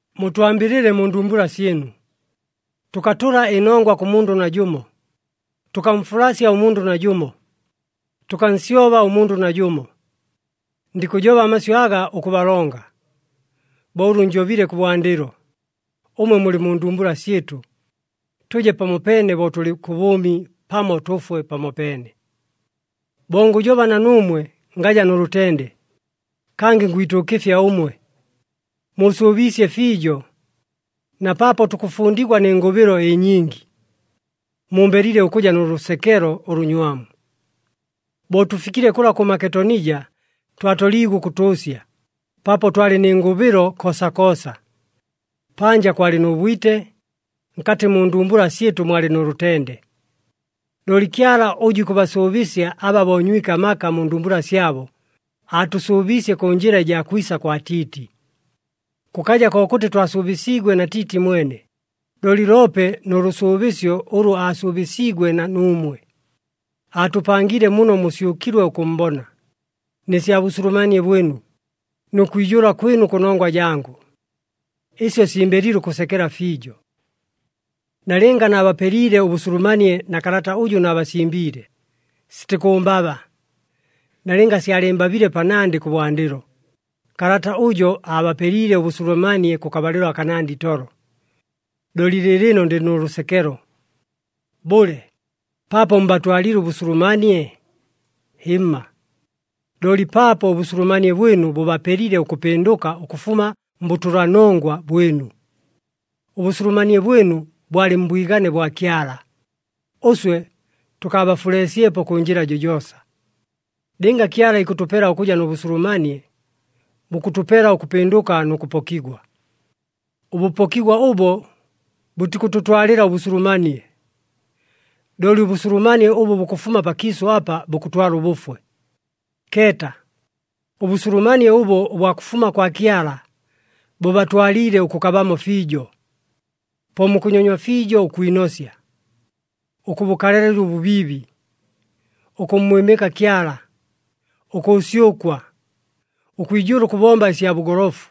Mutwambɨlɨle mu ndumbula syɨnu! Tʉkatʉla ɨnongwa kʉ mundʉ najʉmo. Tʉkamfulasya ʉmundʉ najʉmo. Tʉkansyoba ʉmundʉ najʉmo. Ndikʉjoba amasyʉ aga ʉkʉbalonga. Bo ʉlʉ njobile kʉbwandɨlo, ʉmwe mulɨ mu ndumbula syɨtʉ, tʉje pamopeene bo tʉlɨ kʉ bʉʉmi pamo tʉfwe pamopeene. Bo ngʉjoba na nuumwe ngaja nʉ lʉtende. Kangɨ ngwituukɨfya ʉmwe. Muusʉʉbiisye fiijo. Na paapo tukʉfundigwa nɨ ngʉbɨlo ɨnyingi, mumbelile ʉkʉja nʉ lʉsekelo ʉlʉnywamu. Bo tʉfikile kʉla kʉ Maketonija twatoliigwe ʉkʉtʉʉsya, paapo twalɨ nɨ ngʉbɨlo koosakoosa. Panja kwalɨ nʉ bwite, nkatɨ mu ndumbula syɨtʉ mwalɨ nʉ lʉtende. Looli Kyala ʉjʉ ikʉbasʉʉbɨsya aba boonywike amaka mu ndumbula syabo, aatʉsʉʉbiisye kʉ njɨla ɨjaa kwisa kwa Tiiti. Kʉkaja kokʉtɨ twasʉʉbɨsiigwe na Tiiti mwene, looli loope nʉ lʉsʉʉbɨsyo ʉlʉ aasʉʉbɨsiigwe na nuumwe. Aatʉpangiile muno musyʉkilwe ʉkʉʉmbona, nɨ sya bʉsulumanie bwɨnu, nʉ kwijʉʉla kwɨnu kʉnongwa jangʉ. Ɨsyo simbeliile ʉkʉsekela fiijo. Nalɨnga naabapeliile ʉbʉsulumanie na kalata ʉjʉ naabasimbiile, sitikʉʉmbaba. Nalɨnga syalɨɨmbabile panandɨ kʉbwandɨlo, kalata ʉjo aabapeliile ʉbʉsulumanie kʉkabalɨlo akanandɨ itolo. Looli lɨɨlɨno ndɨ nʉ lʉsekelo. Bʉle, paapo mbatwaliile ʉbʉsulumanie? Hɨmma! Looli paapo ʉbʉsulumanie bwɨnu bʉbapelile ʉkʉpɨndʉka ʉkʉfuma mbʉtʉlanongwa bwɨnu. Ʉbʉsulumanie bwɨnu bwalɨ mbwigane bwa Kyala, ʉswe tʉkaabafuleesyepo kʉ njɨla jojoosa. Lɨnga Kyala ikʉtʉpela ʉkʉja nʉ bʉsulumanie, bukʉtʉpela ʉkʉpɨndʉka nʉ kʉpokigwa. Ʉbʉpokigwa ʉbo bʉtikʉtʉtwalɨla ʉbʉsulumanie. Looli ʉbʉsulumanie ʉbʉ bukʉfuma pakiisʉ apa bukʉtwala ʉbʉfwe. Keeta! Ʉbʉsulumanie ʉbo ʉbwa kʉfuma kwa Kyala, bʉbatwaliile ʉkʉkabamo fiijo. Po mukʉnyonywa fiijo ʉkwinosya, ʉkʉbʉkalalɨla ʉbʉbiibi, ʉkʉmmwɨmɨka Kyala, ʉkʉʉsyʉkwa, ʉkwijʉʉla ʉkʉbomba ɨsya bʉgolofu,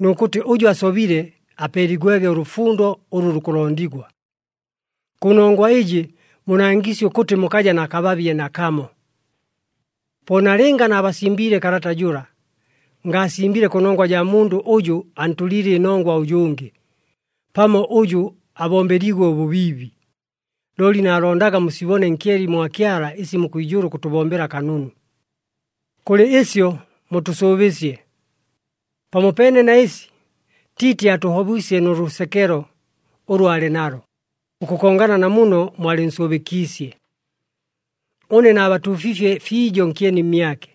nʉ kʉtɨ ʉjʉ asobile apeeligwege ʉlʉfundo ʉlʉ lukʉlondigwa. Kʉnongwa ɨjɨ munangiisye ʉkʉtɨ mukaja na kababye nakamo. Po nalɨnga naabasimbiile kalata jʉla, ngaasimbile kʉnongwa jaa mundʉ ʉjʉ antʉliile ɨnongwa ʉjʉngɨ, pamo ʉjʉ abombeliigwe ʉbʉbiibi. Looli naalondaga musibone nkyeni mwa Kyala ɨsi mukwijʉʉla ʉkʉtʉbombela kanunu. Kʉlɨ ɨsyo mutʉsʉʉbiisye. Pamopeene na ɨsi, Tiiti aatʉhobwisye nʉ lʉsekelo, ʉlʉ aalɨ nalo ʉkʉkongana na muno mwalɨnsʉʉbɨkiisye. Ʉne naabatuufiifye fiijo nkyeni mmyake,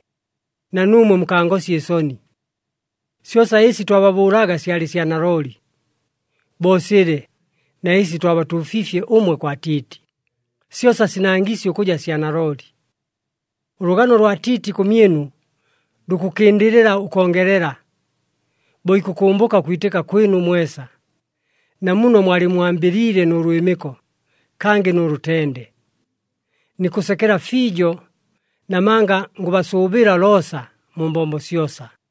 na nuumwe mukangosya ɨsoni. Syosa ɨsi twababʉʉlaga syalɨ sya nalooli. Bo silɨ, na ɨsi twabatuufiifye ʉmwe kwa Tiiti, syosa sinangiisye ʉkʉja sya nalooli. Ʉlʉgano lwa Tiiti kʉmyɨnu lukʉkɨndɨlɨla ʉkongelela, bo ikʉkʉmbʉka ʉkwitɨka kwɨnu mwesa, na muno mwalɨmmwambɨliile nʉ lwɨmɨko, kangɨ nʉ lʉtende. Nikʉsekela fiijo, namanga ngʉbasʉʉbɨla loosa, mu mbombo syosa.